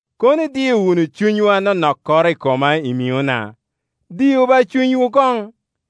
Kono idio wunu cunywu anonokkoro i koma i miŋona. Diu ba cunywu koŋ!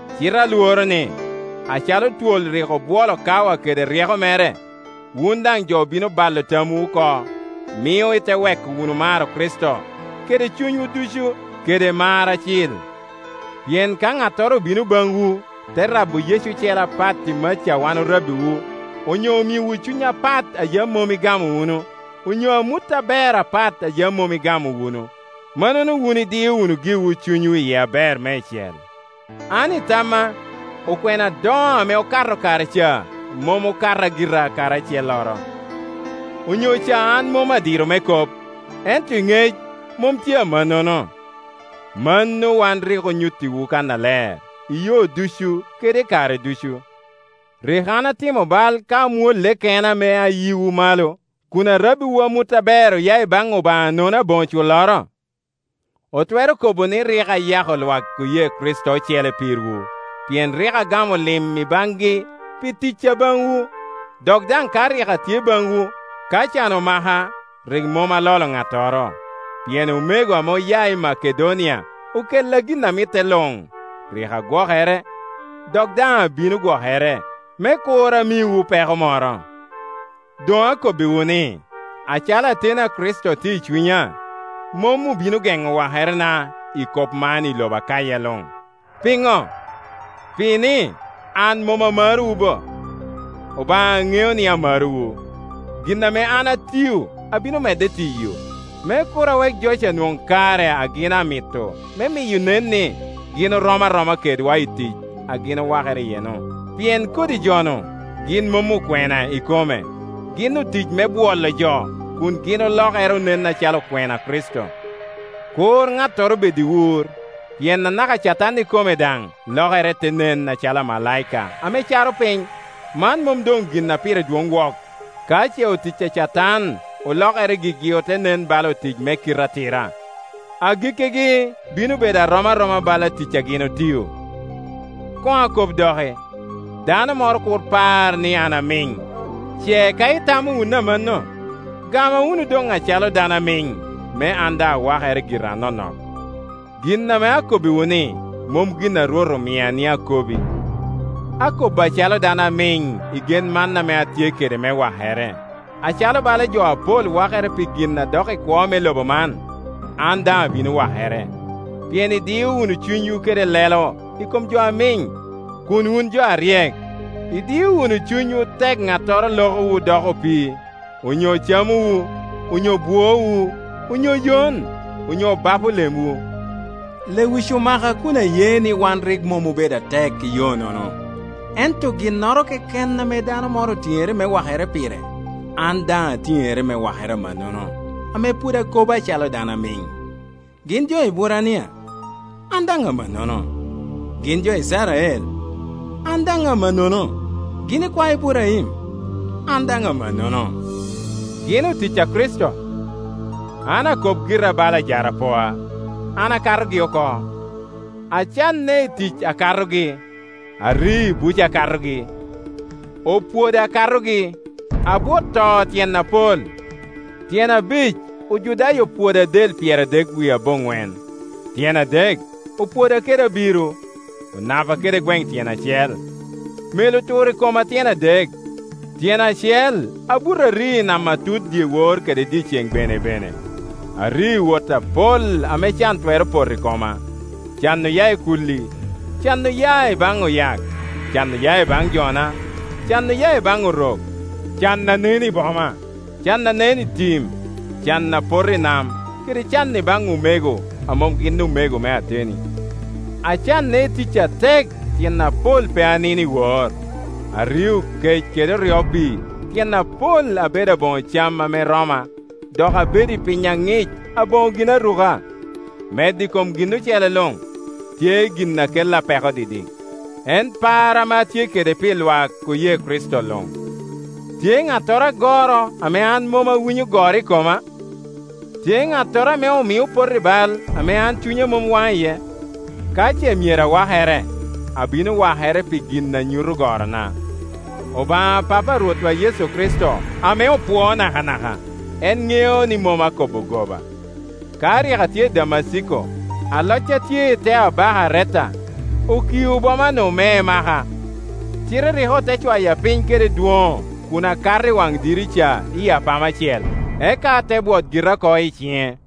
Cite alworo ni, acalo twol rik obwolo Kawa kede ryeko mere, wun daŋ jo bino balo tamwu oko, mio ite weko wunu maro Kricito kede cunywu ducu kede mar acil. Pien ka ŋattoro obino baŋwu, te rabo Yecu ocele a pat i maca a wan orabbiwu, onyo omiowu cuny apat a yam mom igamo wunu, onyo amut aber apat a yam mom igamo wunu, mannono wun idio wunu giwu cunywu iye aber meicel. An i tamma, okwena adoŋo ame okato kare ca mom okata gira kadi acelloro. Onyo ca an mom adiro me kop, ento i ŋec mom tye amannono. Mano wan rik onyuttiwu kannaler, i yo ducu kede i kare ducu. Rik an atimo bal ka amwolle kena me ayiwu malo, kun arabbiwu amut aber oya i baŋ Obaŋa nono aboŋo culloro? Otwero kobo ni rik ayako lwak oye Kricito ocele pirwu, pien rik agamo lim i baŋgi pi ticca baŋwu. Dok daŋ ka rik atye baŋwu, ka can omaka, rik mom alolo ŋattoro, pien omego ame oya i Makedonia okella gin a mitte luŋ; rik agwokere, dok daŋ abino gwokere, me kur amiwu peko moro. Doŋ akobbiwu ni, acalo ateni a Kricito tye i cunya, mom obino geŋo wakerena i kop man i lobo Akaya luŋ. Piŋo? Pi ni an mom amarowu bo? Obaŋa ŋeo ni amarowu. Gin ame an atio abino medde tiyo, me kur awek jo ca onwoŋ kare a gin amito me miyo nen ni gin orom aroma kedwa i tic a gin owakere iye-nu. Pien kodi jo-nu gin mom okwena ikome, gin otic me bwolo jo, kun gin olokere onen acalo okwena a Kricito. Kur ŋattoro bed i wur, pien anaka Catan ikome daŋ lokere te nen acalo amalaika ame caro piny. Man mom doŋgin a pire dwoŋ wok ka ce otic a Catan olokere gigi ote nen bala otic me kite atira; agikkigi bino bedo a rom aroma bala tic a gin otio. Koŋ akob doki, dano moro kur par ni an amiŋ; ce ka itamo wunu amanno, gama wunu doŋ acalo dano amiŋ, me an daŋ awakere gira anonok. (Gin ame akobbiwu-ni mom gin a Rwot omia ni akobi; akobo acalo dano amiŋ i gen man ame atye kede me wakere. Acalo bala jo apol wakere pi gin a dok i kwo me lobo man, an daŋ abino wakere.) Pien idio wunu cunywu kede lelo i kom jo amiŋ, kun wun jo aryek. Idio wunu cunywu tek ŋattoro lokowu doko opii, onyo camowu, onyo buowu, onyo yon, onyo bapo lemwu. Lewic omaka kun aye ni wan rik mom obedo atek i yo-nono. Ento ginnoro keken ame dano moro otiŋere me wakere pire, an daŋ atiŋere me wakere amannono, ame pwod akobo acalo dano amiŋ. Gin jo Eburania? An daŋ amannono. Gin jo Icrael? An daŋ amannono. Gin ikwae Iburaim? An daŋ amannono. Gin otic a Kricito? An akop gira bala ajarapoa, an akatogi oko. Acanne i tic akatogi, ari i buc akatogi, opwoda akatogi, abwot to tyen apol. Tyen abic Ojudaya opwoda del pyeradek wie aboŋwen. Tyen adek opwoda kede abiro, Onapa kede gweŋe tyen acel, mel otur i koma tyen adek, tyen acel abuto ari i nam atut dyewor kede dyeceŋ benebene. Ario i wot apol ame can twero poto i koma, can oya i kuli i, can oya i baŋ oyak, can oya i baŋ jona, can oya i baŋ Orok, can a nen i boma, can a nen i tim, can a poto i nam kede can i baŋ omego a mom gin omego me ateni. Acanne i tic atek; tyen apol pe anino iwor. Ario kec kede oryo pii; tyen apol abedo aboŋo cam ame romma, dok abedo i piny aŋic aboŋo ginaruka. Medde i kom gin ocele luŋ, tye gin a kella peko didik, en par ame atye kede pi lwak oye Kricito luŋ. Tye ŋattoro agoro ame an mom awinyo goro i koma? Tye ŋattoro ame omio opoto i bal ame an cunya mom waŋ iye? Ka ce myero awakere, abino wakere pi gin a nyuto gorona. Obaŋa Papa a Rwotwa Yecu Kricito, ame opwoo nakanaka, en ŋeo ni mom akobo goba. Ka rik atye i Damaciko, aloc a tye i te abaka Areta okio bomanu me emaka, cite rik ote cwaya piny kede dwoŋo kun akato i waŋ dirica i apama cel, eka ate bwot gira oko i ciŋe.